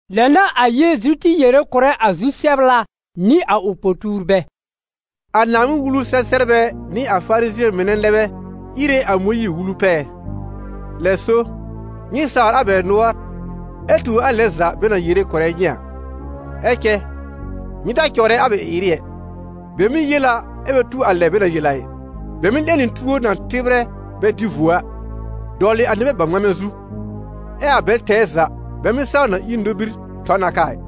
Lɛ n'a a Yeezu tɩ yere kʋ̀rɛ a zu-sɛbla nɩ a ʋ po-tuurbɛ: «A Naaŋmɩn-Wulu-sɛ-sɛbrbɛ nɩ a Farizɩ̃ɛ mɩnɛ nɛ bɛ íre a Mõyiir-Wulu pɛɛ. Lɛ so, nyɩ sawr a bɛ nʋɔr ɛ tuur a lɛn za bɛ na yere kʋ̀rɛ nyɩ a, ɛ cɛ nyɩ ta cɔwrɛ a bɛ ɩ-ɩrɩ ɛ. Bɛ mɩ́ yel a, ɛ bɛ tu a lɛ bɛ na yel a ɩ. Bɛ mɩ́ 'lẽ nɩ tuor na tɩbrɛ bɛ dɩ vuo a, dɔwlɩ a nɩbɛ bawŋmamɛ zu, ɛ a bɛl tɛɛ za bɛ mɩ́ saw na ír nobir tɔ n a kaa ɩ.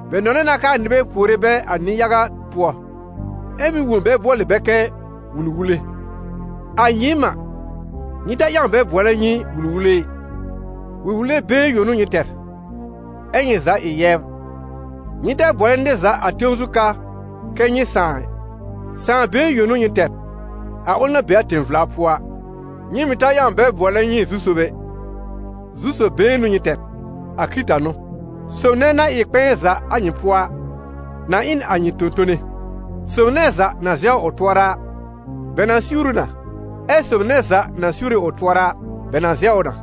Bɛ nɔnɛ na k'aa nɩbɛ puore bɛ a nɩ-yaga pʋɔ, ɛ mɩ́ wõ bɛ bʋɔlɩ bɛ kɛ: ‹Wul-wule.› A nyɩɩm a, nyɩ ta ƴãw bɛ bʋɔlɛ nyɩ ‹Wul-wule› ɩ, Wul-wule been yõ n'ʋ nyɩ tɛr, ɛ nyɩ za ɩ yɛbr. Nyɩ ta bʋɔlɛ nɩr za a tẽw zu ka kɛ nyɩ ‹Sãà› ɩ, Sãà been yõ n'ʋ nyɩ tɛr, a ʋl na be a tẽ-vla pʋɔ a. Nyɩ mɩ̀ ta ƴãw bɛ bʋɔlɛ nyɩ: ‹Zu-sob› ɛ, Zu-sob been n'ʋ nyɩ tɛr, a Kɩrɩta n'ʋ. Sob nɛ na ɩ kpɛ̃ɛ za a nyɩ pʋɔ a, na ɩ n a nyɩ tõ-tone. Sob nɛ za na zɛwr ʋ tʋɔra a, bɛ na siwr ʋ na, ɛ sob nɛ za na siwre ʋ tʋɔra a, bɛ na zɛw ʋ na.»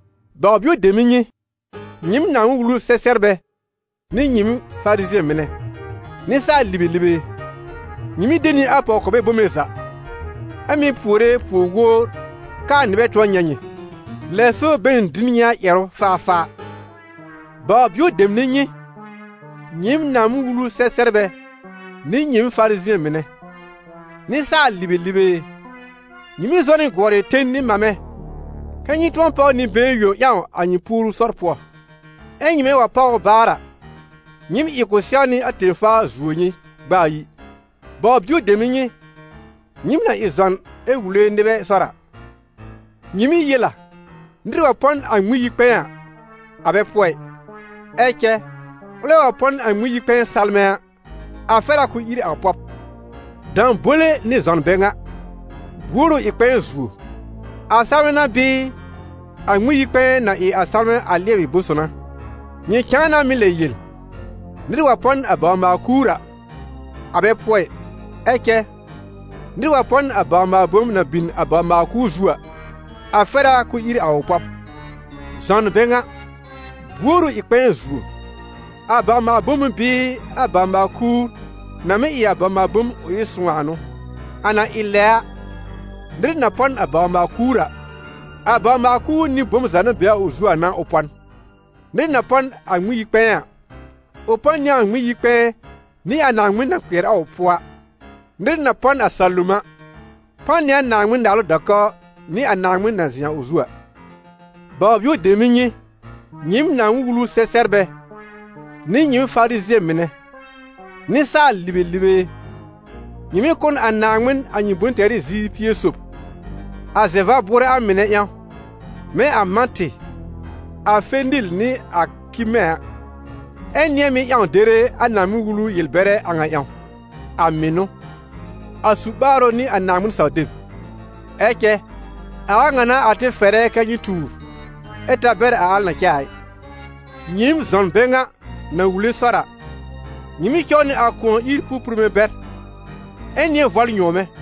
Baw-bio dem ɩ nyɩ, nyɩɩm Naaŋmɩn-Wulu-sɛ-sɛbrbɛ nɩ nyɩɩm Farizɩ̃ɛ mɩnɛ, nɩsaal-libelibe e! Nyɩ mɩ́ de nɩ a pɔw-kɔbɛ bome za, ɛ mɩ́ puore puor-wowr k'aa nɩbɛ tʋ̃ɔ nyɛ̃ nyɩ. Lɛ so bɛ na dɩ n nyɩ a ƴɛrʋ faafaa.] Baw-bio dem ɩ nyɩ, nyɩɩm Naaŋmɩn-Wulu-sɛ-sɛbrbɛ nɩ nyɩɩm Farizɩ̃ɛ mɩnɛ, nɩsaal-libelibe e! Nyɩ mɩ́ zɔ na gʋɔrɩ ten nɩ mamɛ, kɛ́ nyɩ tʋ̃ɔ páw nɩ-been yõ ƴãw a nyɩ puoru sɔr pʋɔ; ɛ nyɩmɛ wa páw ʋ baar a, nyɩɩm ɩ k'ʋ sɛwnɩ a tẽ-faa zuo nyɩ gb'a ayi. Baw-bio dem ɩ nyɩ, nyɩɩm na ɩ zɔn ɛ wule nɩbɛ sɔr a! Nyɩ mɩ́ yel a: ‹Nɩr wa pɔ n a Ŋmɩn-yi-kpɛ̃ɛ a, a bɛ pʋɔ ɩ; ɛ cɛ ʋlɛ wa pɔ n a Ŋmɩn-yi-kpɛ̃ɛ salmɛ̃ a, a fɛr a k'ʋʋ ír a ʋ pɔb.› Dãbole nɩ zɔn bɛ ŋa! Buor ʋ ɩ kpɛ̃ɛ zuo: a salmɛ̃ n'a bɩɩ a Ŋmɩn-yi-kpɛ̃ɛ na ɩ a salmɛ̃ a lɩɛbɩ bʋ̃-son a? Nyɩ cãa na mɩ́ lɛ yel: ‹Nɩr wa pɔ n a bawr-maal-kuur a, a bɛ pʋɔ ɩ; ɛ cɛ nɩr wa pɔ n a bawr-maal-bom na bin a bawr-maal-kuur zu a, a fɛr a k'ʋʋ ír a ʋ pɔb.› Zɔn bɛ ŋa! Buor ʋ ɩ kpɛ̃ɛ zuo: a bawr-maal-bom n'ʋ bɩɩ a bawr-maal-kuur na mɩ́ ɩ a bawr-maal-bom ʋ ɩ sõw a n'ʋ? A na ɩ lɛ a, nɩr na pɔ n a bawr-maal-kuur a, a bawr-maal-kuur nɩ bom za na be a ʋ zu a n'a ʋ pɔ n. Nɩr na pɔ n a Ŋmɩn-yi-kpɛ̃ɛ a, ʋ pɔ n nɩ a Ŋmɩn-yi-kpɛ̃ɛ nɩ a Naaŋmɩn na kpɩɛr a ʋ pʋɔ a. Nɩr na pɔ n a salom a, pɔ n nɩ a Naaŋmɩn-Naalʋ da-kɔw nɩ a Naaŋmɩn na zɩ̃ a ʋ zu a. Baw-bio dem ɩ nyɩ, nyɩɩm Naaŋmɩn-Wulu-sɛ-sɛbrbɛ nɩ nyɩɩm Farizɩ̃ɛ mɩnɛ, nɩsaal-libelibe e! Nyɩ mɩ́ kʋ̀ n a Naaŋmɩn a nyɩ bʋ̃-tɛrɩ ziir pie sob, a zɛ-va-bʋʋrɛ a mɩnɛ ƴãw, mɛ̃ a mãtɩ, a fenil nɩ a kimɛ̃ a, ɛ nɩ̃ɛ mɩ́ ƴãw dere a Naaŋmɩn-Wulu yel-bɛrɛ a ŋa ƴãw: a mɩnʋ, a su-ɓaarʋ nɩ a Naaŋmɩn-saw-deb. Ɛ cɛ a a ŋa n'a a tɩ fɛrɛ kɛ nyɩ tuur, ɛ ta bɛr a al na cɛ a ɩ. Nyɩɩm zɔn bɛ ŋa na wule sɔr a! Nyɩ mɩ́ cɔw nɩ a kʋ̃ɔ ír pũpurme bɛr, ɛ nɩ̃ɛ vɔl nyɔ̃wmɛ̃.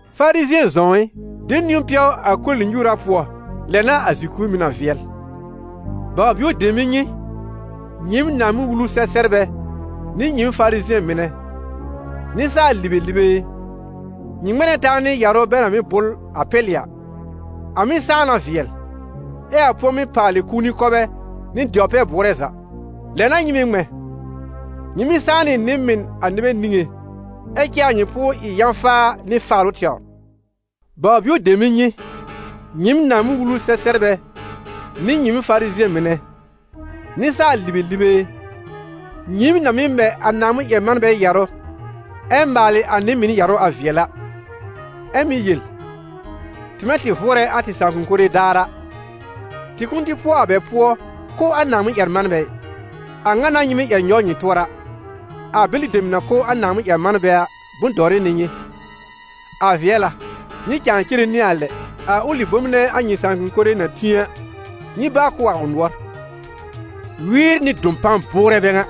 Farizɩ̃ɛ zɔ̃w ɩ! De niwn pɛw a koli-nyuura pʋɔ, lɛ n'a a zi-kur mɩ̀ na vɩɛl. Baw-bio dem ɩ nyɩ, nyɩɩm Naaŋmɩn-Wulu-sɛ-sɛbrbɛ nɩ nyɩɩm Farizɩ̃ɛ mɩnɛ, nɩsaal-libelibe e! Nyɩ ŋmɛ̃ na taa nɩ yarʋ bɛ na bʋl a pɛlɩ a: a mɩ́ sãá na vɩɛl, ɛ a pʋ̃ɔmɩ́ paalɩ kũuni kɔbɛ nɩ dɛwr-pɛ-bʋʋrɛ za. Lɛ n'a nyɩ mɩ̀ ŋmɛ̃: nyɩ mɩ́ sãá nɩ nɩ-mɩn a nɩbɛ niŋé, ɛ cɛ a nyɩ pʋʋr ɩ yã-faa nɩ faalʋ tɛwr. Baw-bio dem ɩ nyɩ, nyɩɩm Naaŋmɩn-Wulu-sɛ-sɛbrbɛ nɩ nyɩɩm Farizɩ̃ɛ mɩnɛ, nɩsaal-libelibe e! Nyɩɩm na mɩ́ mɛ a Naaŋmɩn-ƴɛr-manbɛ yarʋ, ɛ maalɩ a nɩ-mɩn yarʋ a vɩɛl a, ɛ mɩ́ yel: ‹Tɩmɛ tɩ vʋʋrɛ a tɩ sãakʋm mɩnɛ daar a, tɩ kʋ̃ʋ tɩ pʋɔ a bɛ pʋɔ kʋ́ a Naaŋmɩn-ƴɛr-manbɛ ɩ.› A ŋa n'a nyɩ mɩ́ ƴɛr nyɔw nyɩ tʋɔra: a bɛlɩ dem na kʋ́ a Naaŋmɩn-ƴɛr-manbɛ a, bʋ̃-dɔwrɩ n'ɩ nyɩ. A vɩɛl a! Nyɩ cãa cere nɩ a lɛ, a ʋlɩ bom nɛ a nyɩ sãakʋm mɩnɛ na tĩ a, nyɩ báa kʋ́ a ʋ nʋɔr! Wɩɩr nɩ dɔpan bʋʋrɛ bɛ ŋa!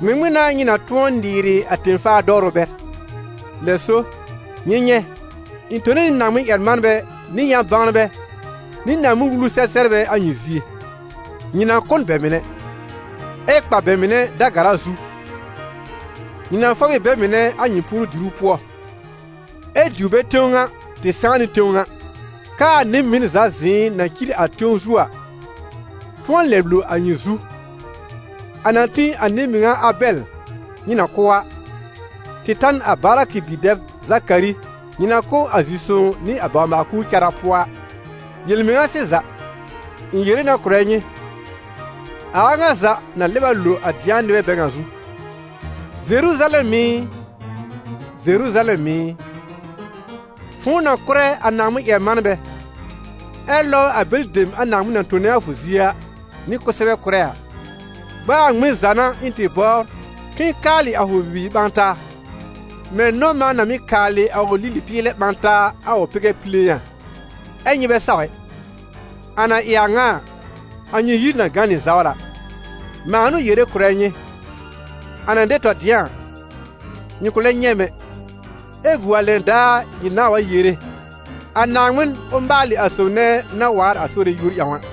Ŋmɩŋmɩn n'a nyɩ na tʋ̃ɔ nɩɩrɩ a tẽ-faa dɔwrʋ bɛr? Lɛ so, nyɩ nyɛ̃, ɩ̃ tone nɩ Naaŋmɩn-ƴɛr-manbɛ, nɩ yã-bãwnbɛ, nɩ Naaŋmɩn-wulu sɛ-sɛbrbɛ a nyɩ zie. Nyɩ na kʋ́ n bɛ mɩnɛ, ɛ kpa bɛ mɩnɛ da-gara zu, nyɩ na fɔb ɩ bɛ mɩnɛ a nyɩ puoru-diru pʋɔ, ɛ diw bɛ tẽw ŋa tɩ sãá nɩ tẽw ŋa, k'aa nɩ-mɩn za zɩ̃ɩ na cir a tẽw zu a, tʋ̃ɔ lɛb lo a nyɩ zu, a na tĩ a nɩ-mɩŋa Abɛl nyɩ na kʋ́ a, tɩ ta n a Barakɩ bi-dɛb Zakari nyɩ na kʋ́ a zi-sõw nɩ a bawr-maal-kuur cara pʋɔ a. Yel-mɩŋa sɩza, ɩ̃ yere na kʋ̀rɛ nyɩ, a a ŋa za na lɛb a lo a dɩ̃a nɩbɛ bɛ ŋa zu.» «Zeruzalɛm ɩ! Zeruzalɛm ɩ! Fʋ̃ʋ na kʋ́rɛ a Naaŋmɩn-ƴɛr-manbɛ, ɛ lɔbr a bɛlɩ dem a Naaŋmɩn na tone a fʋ zie a nɩ kʋsɛbɛ kʋ́rɛ a, gb'a a ŋmɩn za n'a ɩ̃ tɩ bɔbr k'ɩ̃ɩ kaalɩ a fʋ bibiir ɓã taa, mɛ̃ nɔ-mã na mɩ́ kaalɩ a ʋ lili-pɩɩlɛ ɓã taa a ʋ pɩgɛ pile a, ɛ nyɩ bɛ saw ɛ! A na ɩ a ŋa a, a nyɩ yir na gã nɩ zawla. Mãa n'ʋ yere kʋ̀rɛ nyɩ, a na dɛ tɔ dɩ̃a a, nyɩ kʋ̃ lɛ nyɛ̃ m ɛ, ɛ gu a lɛn daar nyɩ nãà wa yere: ‹A Naaŋmɩn, ʋ maalɩ a sob nɛ na waar a Sore yúor ƴãw a!›»